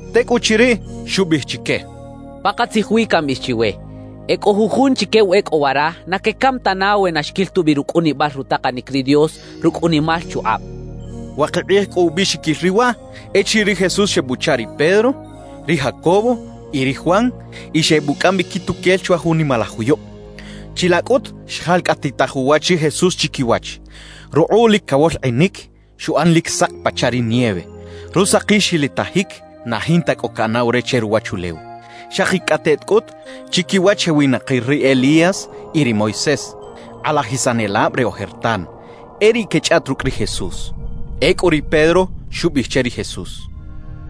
Tecꞌuchiriꞌ, xubiꞌij chique: —Pakatzij wi cambiꞌij chiwe: E cꞌo jujun chique wa e cꞌo wara, na quecam tana we na xquil tubi rucꞌunibal rutakanic ri Dios rucꞌ unimal chukꞌab —xchaꞌ. Wakib kꞌij cꞌu ubiꞌxiquil riꞌ waꞌ, echiriꞌ ri Jesús xebuchaꞌ ri Pedro, ri Jacobo y ri Juan y xebucꞌam bi quituquel chwa jun nimalaj juyub. Chilaꞌ cꞌut xjalcꞌatitaj uwach ri Jesús chiquiwach. Rukꞌuꞌ lic cawolkꞌinic, xuꞌan lic sak pachaꞌ ri nieve; rusakil xilitajic na jinta cꞌo caꞌanaw re che ruwachulew. Xakicꞌateꞌt cꞌut chiquiwach xewinakir ri Elías y ri Moisés, kꞌalajisanelab re ojertan; e riꞌ quechꞌaꞌt rucꞌ ri Jesús. Ecꞌu ri Pedro xubiꞌij che ri Jesús: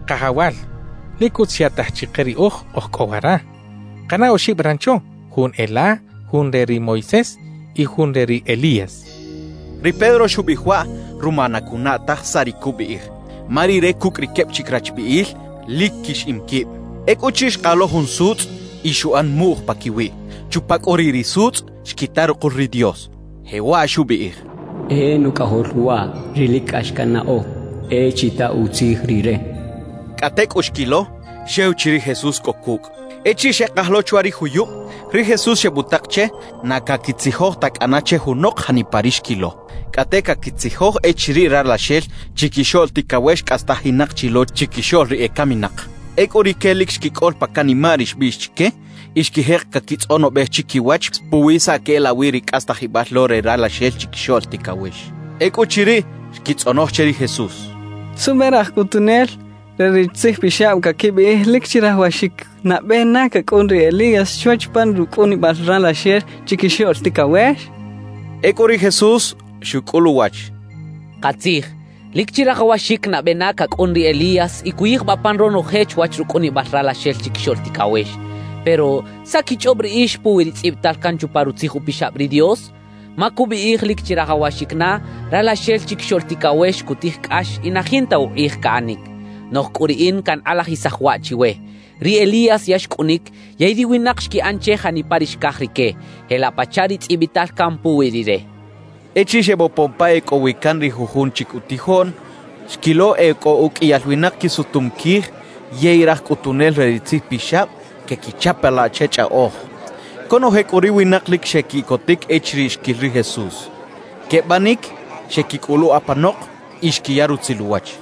—Kajawal, lic utz xyaꞌtaj chike riꞌoj oj cꞌo wara. Kaꞌana oxib rancho: jun e la, jun re ri Moisés y jun re ri Elías —xchaꞌ. Ri Pedro xubiꞌij waꞌ ruma na cunaꞌ taj saꞌ ri cubiꞌij, ma rire cucꞌ ri queb chic rachbiꞌil lic quixiꞌim quib. Ecꞌuchiriꞌ, xkaj lo jun sutzꞌ y xuꞌan muꞌj paquiwiꞌ. Chupa cꞌu riꞌ ri sutzꞌ xquita rukul ri Dios, jewaꞌ xubiꞌij: «E Nucꞌajol waꞌ ri lic cꞌax cannaꞌo; e chita utzij Rire» xchaꞌ. Cꞌate cꞌu xquilo, xew chi ri Jesús cꞌo cucꞌ. Echiriꞌ xekaj lo chwa ri juyub, ri Jesús xebutak che na caquitzijoj ta cꞌana che junok janipa ri xquilo; cꞌate caquitzijoj echiriꞌ Ralaxel Chiquixoꞌl Ticawex cꞌastajinak chi lo chiquixoꞌl ri ecaminak. Ecꞌu rique lic xquicꞌol pa canimaꞌ ri xbiꞌx chique y xquijek caquitzꞌonobej chiquiwach puwi saꞌ queꞌelawi ri cꞌastajibal lo re Ralaxel Chiquixoꞌl Ticawex. Ecꞌuchiriꞌ, xquitzꞌonoj che ri Jesús: —¿Suꞌbe raj cꞌutunel re ri tzijpixab caquibiꞌij lic chirajawaxic nabe na cacꞌun ri Elías chwach pan rucꞌunibal Ralaxel Chiquixoꞌl Ticawex? —xechaꞌ. Ecꞌu ri Jesús xucꞌul uwach: —Katzij, lic chirajawaxic nabe na cacꞌun ri Elías y cuyijbaꞌ pan ronoje chwach rucꞌunibal Ralaxel Chiquixoꞌl Ticawex. Pero ¿saꞌ quichꞌob riꞌix puwi ri tzꞌibital can chupa Rutzij Upixab ri Dios? Ma cubiꞌij lic chirajawaxic na, Ralaxel Chiquixoꞌl Ticawex cutij cꞌax y na jinta ukꞌij caꞌanic. Noꞌj cꞌu riꞌin cankꞌalajisaj waꞌ chiwe: Ri Elías ya xcꞌunic yey ri winak xquiꞌan che janipa ri xcaj rique, jelaꞌ pachaꞌ ri tzꞌibital can puwi rire —xchaꞌ. Echiriꞌ xebopon pa e cꞌo wi can ri jujun chic utijoꞌn, xquilo e cꞌo uqꞌuiyal winak quisutum quij yey raj cꞌutunel re ri tzijpixab quequichapalaꞌ che chꞌaꞌoj. Conoje cꞌu ri winak lic xequiꞌcotic echiriꞌ xquil ri Jesús. Quebanic xeꞌquicꞌuluꞌ apanok y xquiya rutzil uwach.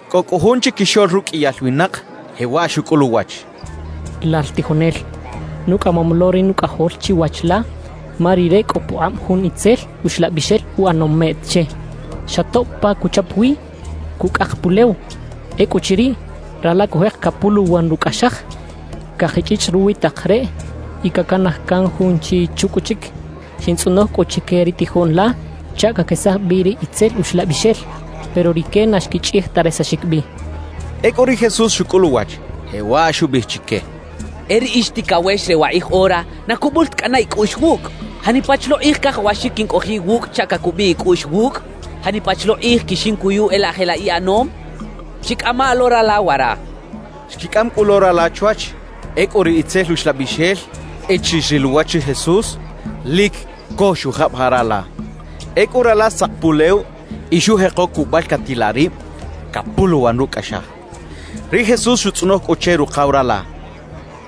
Cꞌo cꞌu jun chiquixoꞌl ruqꞌuiyal winak jewaꞌ xucꞌul uwach: —Lal tijonel, nucꞌamom lo ri nucꞌajol chiwach la, ma rire cꞌo pukꞌab jun itzel uxlabixel uꞌanom meꞌt che. Xa tob pa cuchap wi, cucꞌak pulew. Ecꞌuchiriꞌ, rala cujek capuluwan rucꞌaxaj, cakichꞌichꞌ ruwi tak reꞌ y cacanaj can junchi chucꞌuchic. Xintzꞌonoj cꞌu chique ri tijoꞌn la chaꞌ caquesaj bi ri itzel uxlabixel, pero rique na xquichꞌij ta resaxic bi —xchaꞌ. Ecꞌu ri Jesús xucꞌul uwach, jewaꞌ xubiꞌij chique: —¡E ri ix ticawex re wakꞌij ora, na cubul ta cꞌana icꞌuꞌx wucꞌ! ¿Janipa chi lo kꞌij cajawaxic quincꞌojiꞌ iwucꞌ chaꞌ cacubiꞌ icꞌuꞌx wucꞌ? ¿Janipa chi lo kꞌij quixincuyu e laꞌ jelaꞌ iꞌanom? Chicꞌama lo rala wara —xchaꞌ. Xquicꞌam cꞌu lo rala chwach. Ecꞌu ri itzel uxlabixel echiriꞌ xril uwach ri Jesús, lic co xujabajaꞌ rala. Ecꞌu rala xtzak pulew y xujeko cubalcatilaꞌ rib, capuluwan rucꞌaxaj. Ri Jesús xutzꞌonoj cꞌu che rukaw rala: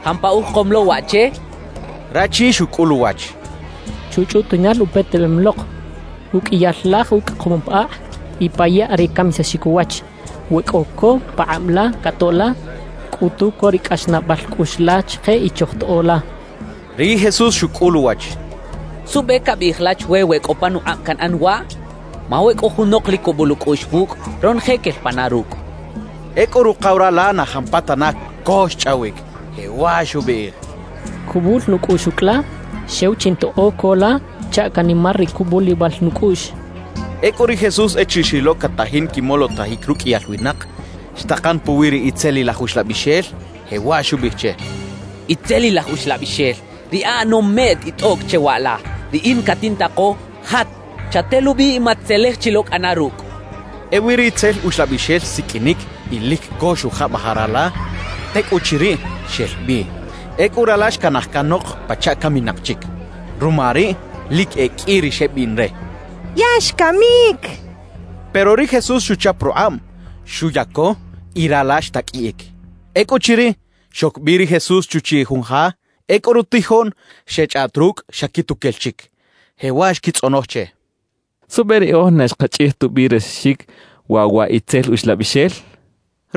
—¿Jampa ujekom lo waꞌ che? —xchaꞌ. Rachi xucꞌul uwach: —Chuchꞌutiꞌnal upetebem lok. Uqꞌuiyal laj ucꞌakom pa akꞌ y pa yaꞌ re camisaxic uwach. We cꞌo co pakꞌab la catoꞌ la, cꞌutu co ri cꞌaxnaꞌbal cꞌuꞌx la chike y chojtoꞌo la —xchaꞌ. Ri Jesús xucꞌul uwach: —¿Suꞌbe cabiꞌij la chwe we cꞌo panukꞌab canꞌan waꞌ? Ma we cꞌo junok lic cubul ucꞌuꞌx wucꞌ, ronoje quel pana rucꞌ —xchaꞌ. Ecꞌu rukaw rala na jampatana co xchꞌawic, jewaꞌ xubiꞌij: —Cubul nucꞌuꞌx ucꞌ la, xew chintoꞌo co la chaꞌ canimar ri cubulibal nucꞌuꞌx —xchaꞌ. Ecꞌu ri Jesús echiriꞌ xrilo catajin quimolotajic ruqꞌuiyal winak, xtakan puwi ri itzelilaj uxlabixel, jewaꞌ xubiꞌij che: —Itzelilaj uxlabixel, ri aꞌanom meꞌt y tꞌoꞌc che waꞌla, riꞌin catintako: Jat, chatelubi y mat-tzelej chi lo cꞌana rucꞌ —xcha che. Ewi ri itzel uxlabixel xsiqꞌuinic y lic co xujabajaꞌ rala; tecꞌuchiriꞌ, xel bi. Ecꞌu rala xcanaj canok pachaꞌ caminak chic. Ruma riꞌ, lic e qꞌui ri xebiꞌn re: «Ya xcamic» xechaꞌ. Pero ri Jesús xuchap rukꞌab, xuyaco; y rala xtaqꞌuiꞌic. Ecꞌuchiriꞌ, xoc bi ri Jesús chuchiꞌ jun ja. Ecꞌu rutijoꞌn xechꞌaꞌt rucꞌ xa quituquel chic, jewaꞌ xquitzꞌonoj che: —¿Suꞌbe riꞌoj na xkachꞌij tubi resaxic waꞌ wa itzel uxlabixel? —xechaꞌ.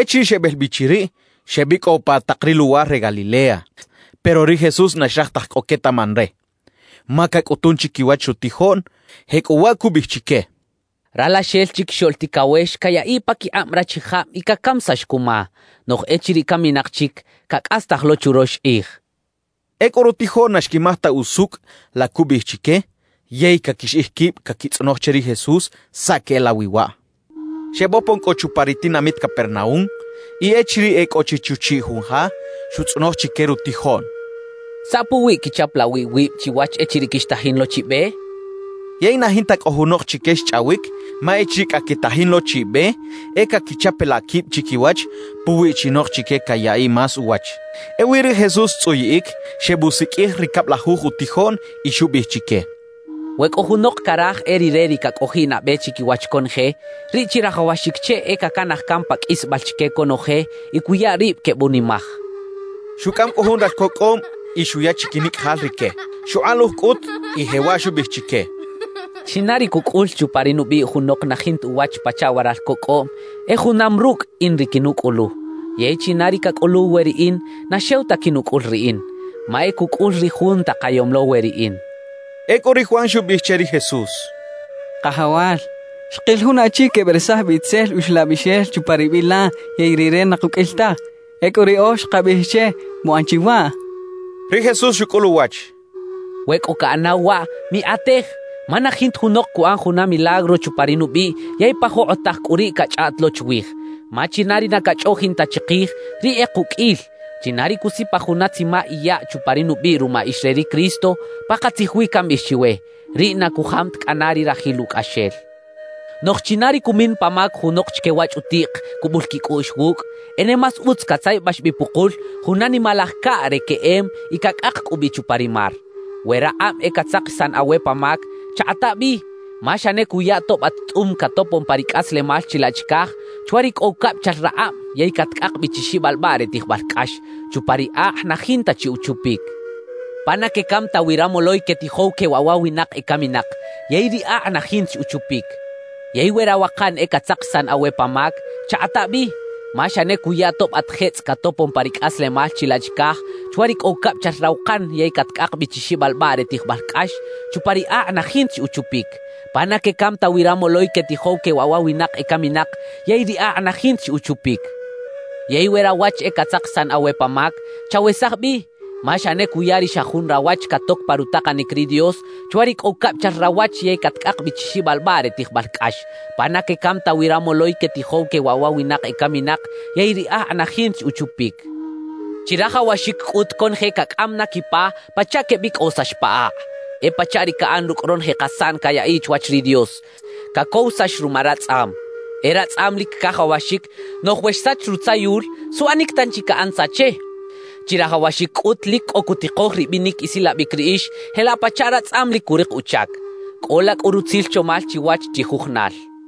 Echiriꞌ xebel bi chiriꞌ, xebicꞌow pa tak ri luwar re Galilea. Pero ri Jesús na xraj taj cꞌo quetaꞌman re, ma cacꞌutun chiquiwach rutijoꞌn. Jecꞌuwaꞌ cubiꞌij chique: «Ralaxel Chiquixoꞌl Ticawex cayaꞌiꞌ paquikꞌab rachijab y cacamisax cuma, noꞌj echiriꞌ caminak chic, cacꞌastaj lo churox kꞌij» xchaꞌ. Ecꞌu rutijoꞌn na xquimaj ta usucꞌ la cubiꞌij chique, yey caquixiꞌij quib caquitzꞌonoj che ri Jesús saꞌ queꞌelawi waꞌ. Xebopon cꞌu chupa ri tinamit Capernaúm y echiriꞌ e cꞌo chi chuchiꞌ jun ja, xutzꞌonoj chique rutijoꞌn: —¿Saꞌ puwi quichapalaꞌ wi iwib chiwach echiriꞌ quixtajin lo chi be? —xcha chique. Yey na jinta cꞌu junok chique xchꞌawic; ma echiriꞌ cꞌa quetajin lo chi be, e caquichapalaꞌ quib chiquiwach puwiꞌ chinok chique cayaꞌiꞌ más uwach. Ewi ri Jesús xtzꞌuyiꞌic, xebusiqꞌuij ri cablajuj utijoꞌn y xubiꞌij chique: —We cꞌo junok caraj e rire ri cacꞌojiꞌ nabe chiquiwach conoje, riꞌ chirajawaxic che e cacanaj can pa qꞌuisbal chique conoje y cuya rib quebunimaj —xcha chique. Xucꞌam cꞌu jun ralco cꞌoꞌm y xuya chiquinicꞌajal rique. Xukꞌaluj cꞌut y jewaꞌ xubiꞌij chique: —China ri cucꞌul chupa ri nubiꞌ junok na jinta uwach pachaꞌ wa ralco cꞌoꞌm, e junam rucꞌ in ri quinucꞌulu; yey china ri cacꞌuluw we riꞌin, na xew ta quinucꞌul riꞌin, ma e cucꞌul ri Jun takayom lo we riꞌin —xchaꞌ. Ecꞌu ri Juan xubiꞌij che ri Jesús: —Kajawal, xkil jun achi queberesaj bi itzel uxlabixel chupa ri biꞌ la yey rire na kuqꞌuil taj. Ecꞌu riꞌoj xkabiꞌij che muꞌan chi waꞌ —xechaꞌ. Ri Jesús xucꞌul uwach: —We cꞌo caꞌanaw waꞌ, mikꞌatej, ma na jinta junok cuꞌan juna milagro chupa ri nubiꞌ yey pa jokꞌotaj cꞌu riꞌ cachꞌaꞌt lo chwij. Ma china ri na cachꞌoꞌjin ta chikij, riꞌ e kuqꞌuil. China ri cusipaj juna tzima iyaꞌ chupa ri nubiꞌ ruma ix re ri Cristo, pakatzij wi cambiꞌij chiwe, riꞌ na cujam ta cꞌana ri rajil ucꞌaxel. »Noꞌj china ri cumin pa mac junok chique wa chꞌutiꞌk cubul quicꞌuꞌx wucꞌ, e ne más utz catzayabax bi pukul juna nimalaj caꞌ re queꞌem y cacꞌak cꞌu bi chupa ri mar. »We rakꞌab e catzakisan awe pa mac, chakꞌata bi. Ma xa ne cuya tob at tꞌum catopon pa ri cꞌaslemal chilaꞌ chicaj, chwa ri cꞌo ucabichal rakꞌab yey catcꞌak bi chi xibalbaꞌ re tijbal cꞌax, chupa ri akꞌ na jinta chi uchupic pa na quecam ta wi ramoloy quetijow que waꞌ wa winak ecaminak, yey ri akꞌ na jinta chi uchupic. »Yey we rawakan e catzakisan awe pa mac, chakꞌata bi. Ma xa ne cuya tob at jetzꞌ catopon pa ri cꞌaslemal chilaꞌ chicaj, chwa ri cꞌo ucabichal rawakan yey catcꞌak bi chi xibalbaꞌ re tijbal cꞌax, chupa ri akꞌ na jinta chi uchupic pa na quecam ta wi ramoloy quetijow que waꞌ wa winak ecaminak, yey ri akꞌ na jinta chi uchupic. »Yey we rawach e catzakisan awe pa mac, chawesaj bi. Ma xa ne cuya ri xa jun rawach catoc pa rutakanic ri Dios, chwa ri cꞌo ucabichal rawach yey catcꞌak bi chi xibalbaꞌ re tijbal cꞌax pa na quecam ta wi ramoloy quetijow que waꞌ wa winak ecaminak, yey ri akꞌ na jinta chi uchupic. »Chirajawaxic cꞌut conoje cacꞌam na quipa, pachaꞌ quebicꞌowisax pa akꞌ. E pachaꞌ ri caꞌan rucꞌ ronoje kasaꞌn cayaꞌiꞌ chwach ri Dios: cacowisax ruma ratzꞌam. E ratzꞌam lic cajawaxic, noꞌj we xsach rutzayul, ¿suꞌanic tanchi caꞌan tza che? Chirajawaxic cꞌut lic cꞌo cutikoj ribinic isilabic riꞌix jelaꞌ pachaꞌ ratzꞌam lic curik uchac. Cꞌola cꞌu rutzil chomal chiwach chijujunal —xcha chique.